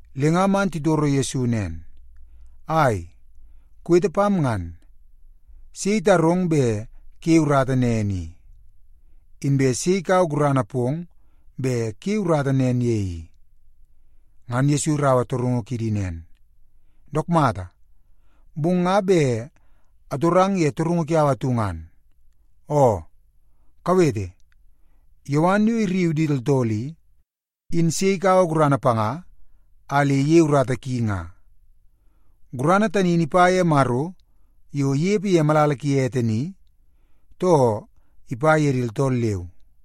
Le nga man titoro Yesu nen, “Ai, kuwete pam ngan! Sei itarong bet kuyei urata nen i? Inbe sei ikaua gurana pong bet kuyei urata nen ye i?” Ngan Yesu iraua torungu kidi nen, “Dook mata, bong nga bet atorang ye torungu kiau atu ngan. Oo, kawete! Yowan yo irriu di tooltool i, in sei ikaua gurana panga a le iyei urata ki nga? Gurana tani in ipa ye Maro yo inepe ye malala ki ete ni, too ipa ye di tooltool leu?”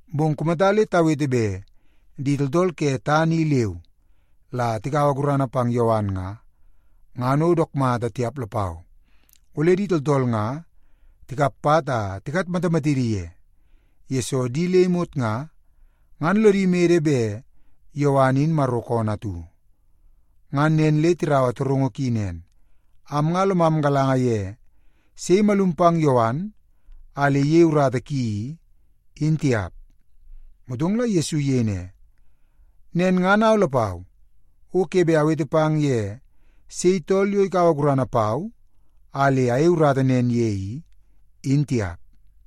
Bong kumata le tawete bet di tooltool ke tana i leu la tikaua gurana pang Yowan nga, ngan o dook mata tiap lapau. Ole di tooltool nga tikap pat a tikatmatamatidi ye, yesoo di le imot nga, ngan lodi mede bet Yowan in Maro koonoo atu.” Ngan nen le tiraua torungu ki nen, “Am nga lomam galanga tiap ye sei imalum pang Yowan a le iyei urata ki i.” Motong la Yesu iyei ne, “Nen ngan au lapau, o ke bet awete pang ye sei tool yo ikaua gurana pau a le ayei urata nen ye i, in tiap.”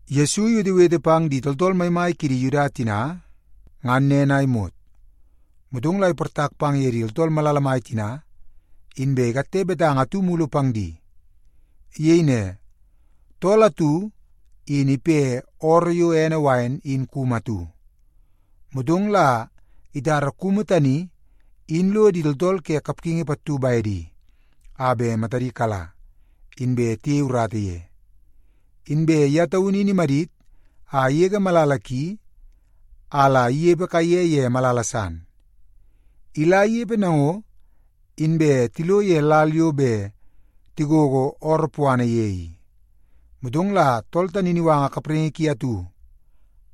Yesu iwetewete pang di tooltool maimai kidi Yuda tina, ngan nen a imot. Motong la iportak pang ye di tooltool malala mai tina, inbe ikatte betanga atu mulu pang di. Iyei ne, “Tool atu in ipe ooroo yo ene wain in kumu atu. Motong la itara kumu tani in lo di tooltool ke kapgingi pattu bedi a bet matadi kala, inbe tiyei urata ye. Inbe ye taunu imadit a igege malala ki a la inepe kaiye ye malala san. Ila inepe nango, inbe tilo ye lal yo bet tigogo ooroo puana ye i, motong la tool tani in iwanga kapraingi ki atu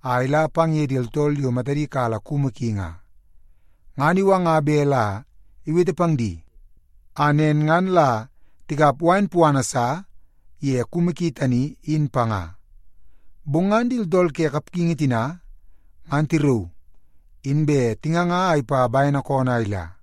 a ila pang ye di tooltool yo matadi kala kumu ki nga. Ngan iwanga bet la iwete pang di, a nen ngan la tikap wain puana sa ye kumu ki tani, in panga. Bong ngan di tooltool ke kapgingi tina ngan tirauu, inbe tinganga a ipa bene koonoo a ila.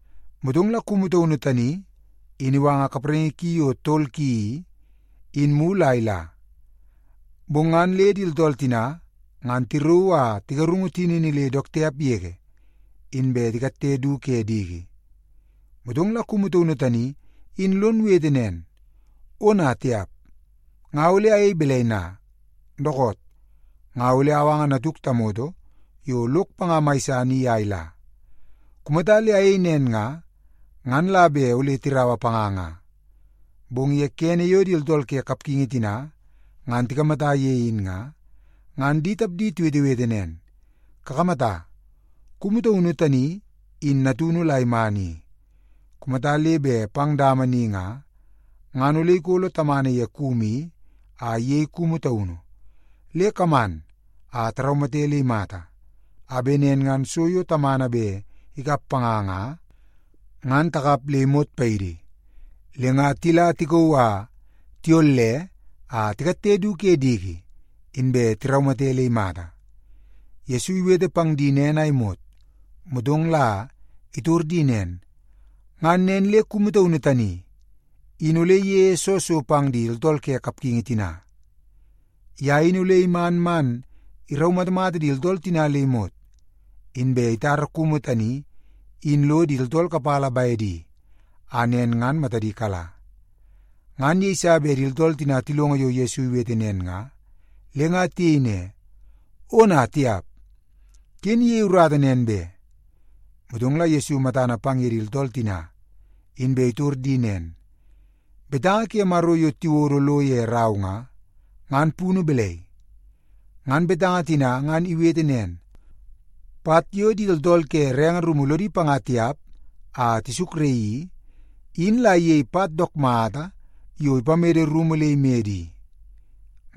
Motong la kumu taunu tani in iwanga kapraingi yo tol ki i, in mulu a ila. Bong ngan le di tooltool tina ngan tirauu a tigarungu tinini le dook tiap yege, inbe tikatte du ke diki. “Motong la kumu taunu tani in lon wete nen, ‘Ona tiap! Nga ole ayei balai na? Dookoot, nga ole awanga natuk tamoto yo lok panga mai san i a ila. Kumata le ayei nen nga, ngan la bet ole tiraua panga nga.’ “Bong ye kene yo di tooltool ke kapgingi tina ngan tikamata ye in nga, ngan di tapdi tiwetewete nen, ‘Kakamata, kumu taunu tani in natunu la iman i. Kumata le bet pang dama ni nga, ngan ole ikolo tamana ye kumu i a iyei kumu taunu. Le kaman a taraumate le imata, a bet nen ngan so yo tamana bet ikap panga nga, ngan takap le imot paidi.’ Le nga tila tikauu a tiyolle a tikatte du ke diki, inbe tiraumate le imata.” Yesu iwete pang di nen a imot, motong la itor di nen, “Ngan nen le kumu taunu tani in ole iyeie soo so pang di tooltool ke kapgingi tina? Ye in ole iman man iraumatamata di tooltool tina le imot, inbe itara kumu tani in lo di tooltool kapala bedi a nen ngan matadi kala.” Ngan yeiso bet di tooltool tina tilongo yo Yesu iwete nen nga, le nga tiyei ne, “Ona tiap! Ken iyei urata nen be!” Motong la Yesu matana pang ye di tooltool tina, inbe itor di nen, “Betanga ke Maro yo tiwodo lo ye rau nga, ngan punu balai? Ngan betanga tina ngan iwete nen, ‘Pat yo di tooltool ke renge rumu lodi panga tiap a tisukraii i, in la iyei pat dook mata yo bet ipamede rumu le imede i.’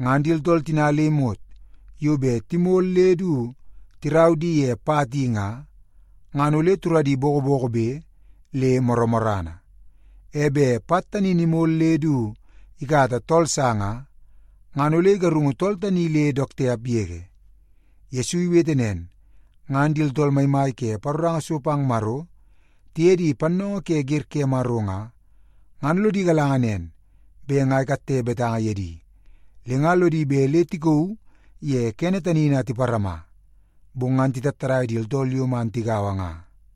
Ngan di tooltool tina le imot yo bet timol le du tirau di pang ye pat i nga, ngan ole turadi bokobokobe le morrana. E bet pat tani in imol le du ikata tool sa nga, ngan ole igarungu tool tani le dook tiap yege.” Yesu iwete nen, ngan di tooltool maimai ke paroranga so pang Maro tiye di pannoongoo ke wer ke Maro nga, ngan lodi galanga nen bet nga ikatte betanga ye di. Le nga lodi bet le tikauu ye kene tani in a tiparama, bong ngan titattadai di tooltool yo man tigaua nga.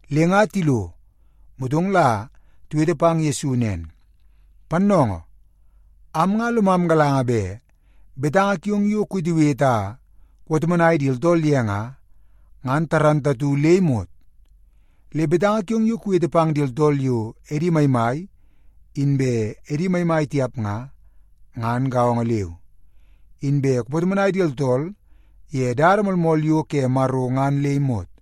Le nga tilo, motong la tiwete pang Yesu nen, “Pannoongoo! Am nga lomam galanga bet betanga kiong yo kuwetewete a kupatomonai di tooltool ye nga, ngan igalanga le imot. Le betanga kiong yo kuwete pang di tooltool yo edi maimai, inbe edi maimai tiap nga, ngan gaongo leu. Inbe kupatomonai di tooltool ye dada moolmool yo ke Maro ngan le imot.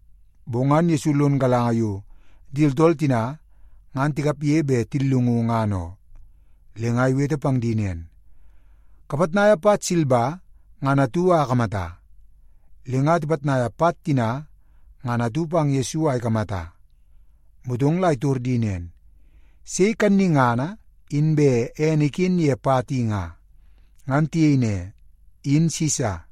Bong ngan Yesu lono galanga yo di tooltool tina ngan tikapge bet tillungu, ngan oo. Le nga iwete pang di nen, “Kapitnaia pat silba ngan atu a akamata.” Le nga tipitnaia pat tina ngan atu pang Yesu a ikamata, motong la itor di nen, “Sei kannungana inbe ene iken ye pat i nga?” Ngan tiyei ne, “In Sisa.”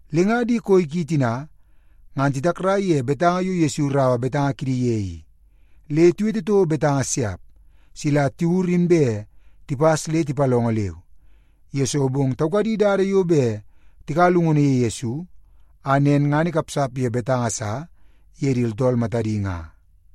Le nga di koi ki tina ngan titakrai ye betanga yo Yesu iraua betanga kidi ye i. Le tiwete toko betanga siap, sila tiwur inbe tipas le tipalongo leu. Yesoo bong taukadi dada yo bet tikaua llungunu ye Yesu, a nen ngan ikapsap ye betanga sa ye di tooltool matadi nga.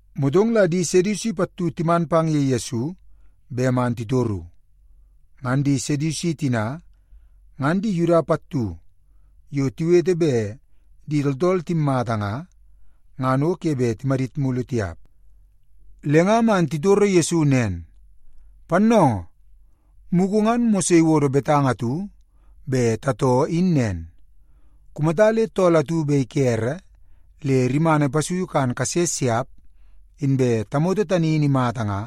Motong la di Sedusi pattu timan pang ye Yesu bet man titoru. Ngan di Sedusi tina, ngan di Yuda pattu yo tiwete bet di tooltool timmata nga, ngan o ke bet timadit mulu tiap. Le nga man titoro Yesu nen, “Pannoongoo, mugu ngan Mose iwodo betanga atu bet tatoo in nen. Kumata le tool atu bet ikere le rimana ipasuiu kan kase siap, inbe tamoto tani in imata nga,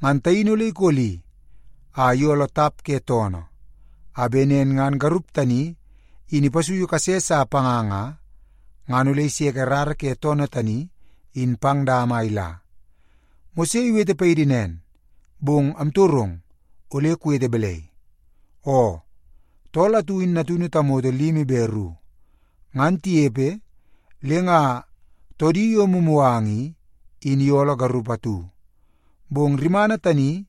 ngan taini ole ikoli a iyooloo tap ke toonoo, a bet nen ngan garup tani in ipasui kase sa panga nga, ngan ole iseke rara ke toonoo tani in pang dama a ila. Mose iwete paidi nen, bong amtorong, ole kuwete balai? Oo, tool atu in natunu tamoto limi be ru. Ngan tinepe, le nga toodi yo mumuganga i, in iyooloo garup atu, bong rimana tani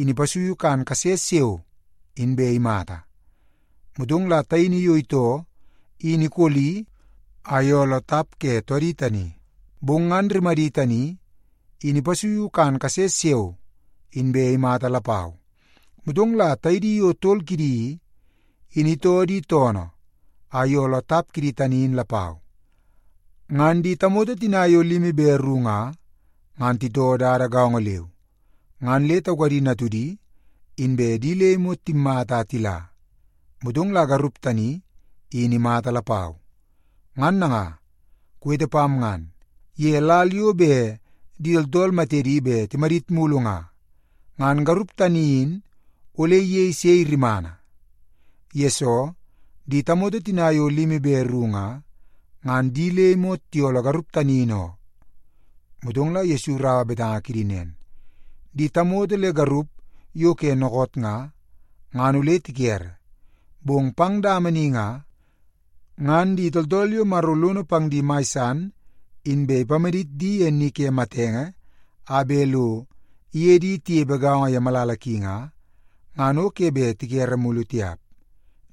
in ipasuiu kan kase siao, inbe imata. Motong la taini yo itoo in ikoli a iyooloo tap ke toodi tani. Bong ngan rimadi tani in ipasuiu kan kase siao, inbe imata lapau. Motong la taidi yo tol kidi i, in itoo di toonoo a iyooloo tap kidi tani in lapau. Ngan di tamoto tina yo limi be ru nga, ngan titoo dada gaongo leu, ngan le taukadi natudi, inbe di le imot timmata a tila. Motong la garup tani, in imata lapau. Ngan nanga, kuwete pam ngan, ye lal yo bet di tooltool matedi bet timadit mulu nga, ngan garup tani in ole iyei sei rimana? Yesoo, di tamoto tina yo limi be ru nga, ngan di le imot tiyooloo garup tani in oo.” Motong la Yesu iraua betanga kidi nen, “Di tamoto le garup yo ke dookoot nga, ngan ole tikere. Bong pang dama ni nga, ngan di tooltool yo Maro lono pang di mai san inbe ipamadit di ye ni ke matenge a bet lo iye di tinepe gaongo ye malala ki nga, ngan o ke bet tikere mulu tiap.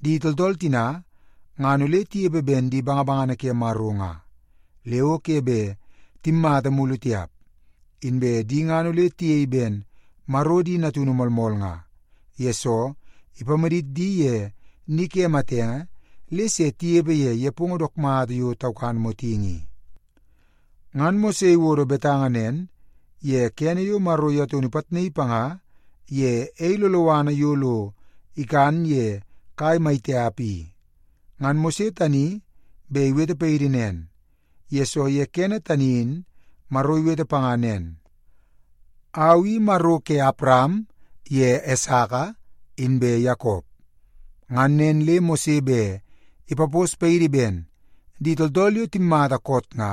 Di tooltool tina ngan ole tinepe ben di bangabangana ke Maro nga, le o ke bet timmata mulu tiap. Inbe di ngan ole tiyei ben Maro di natunu moolmool nga, yesoo ipamadit di ye ni ke matenge le se tinepe ye nepongo dook mata yo taukan motingi i. Ngan Mose iwodo betanga nen ye kene yo Maro ye taunu ipitnaii panga ye ei loloana yo lo ikan ye kai mai tiap i. Ngan Mose tani bet iwete paidi nen, yesoo ye kene tani in Maro iwete panga nen, ‘Au i Maro ke Awaram ye Esaka inbe Yakop.’ Ngan nen le Mose bet ipapos paidi ben di tooltool yo timmata koot nga,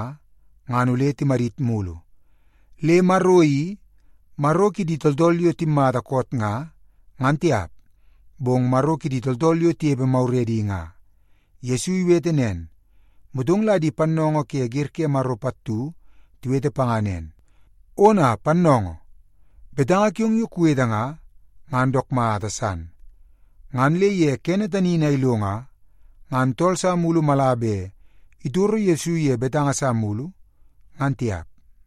ngan ole timadit mulu. Le Maro i, Maro kidi tooltool yo timmata koot nga, ngan tiap, bong Maro kidi tooltool yo tinepe maguredi nga.” Yesu iwete nen, motong la di pannoongoo ke wer ke Maro pattu tiwete panga nen, “Ona, pannoongoo! Betanga kiong yo kuwete nga, ngan dook mata san.” Ngan le ye kene tani in a ilo nga, ngan tool sa mulu mala bet itoro Yesu ye betanga sa mulu, ngan tiap.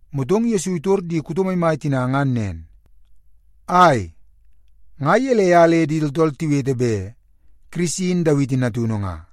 Motong Yesu itor di kuto maimai tina ngan nen, “Ai, nga gelei a le di tooltool tiwete bet Kirisi in Dawiti natunu nga?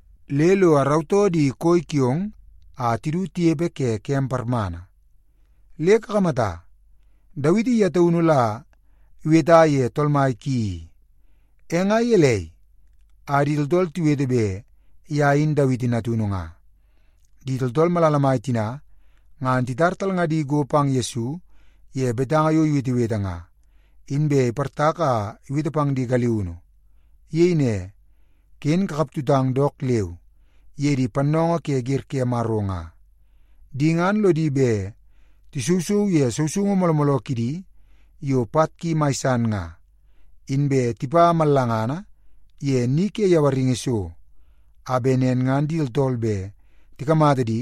le lo arautoo di koi kiong a tidu tinepe ke kem parmana.” ’ Le kakamata, Dawiti ye taunu la iweta ye Tool Mai ki i. E nga gelei a di tooltool tiwete bet ye in Dawiti natunu nga?” Di tooltool malala mai tina ngan titar talngadi go pang Yesu ye betanga yo iwetewete nga, inbe iportak a iwete pang di galiunu. Iyei ne, “Ken kakaptutang dook leu ye di pannoongoo ke wer ke Maro nga. Di ngan lodi bet tisousou ye sousoungu mooloo mooloo kidi yo pat ki mai san nga, inbe tipa mallangana ye ni ke yawaringi so, a bet nen ngan di tooltool bet tikamata di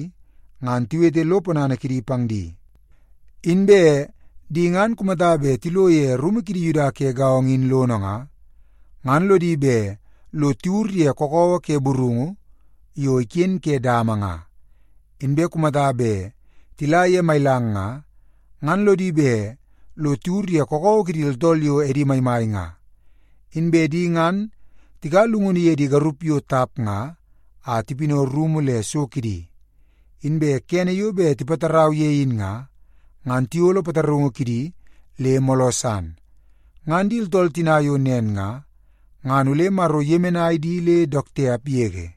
ngan tiwete lo ponana kidi pang di. Inbe di ngan kumata bet tilo ye rumu kidi Yuda ke gaongo in lono nga, ngan lodi bet lo tiwur ye kakawa ke burungu yo iken ke dama nga, inbe kumata bet tila ye mailang nga, ngan lodi bet lo tiwur ye kakawa kidi tooltool yo edi maimai nga. Inbe di ngan tikaua llungunu ye di garup yo tap nga a tipinau rumu le so kidi. Inbe kene yo bet tipatarau ye in nga, ngan tiyolo pataraungu kidi le mooloo san. Ngan di tooltool tina yo nen nga, ngan ole Maro iyemenai di le dook tiap yege.”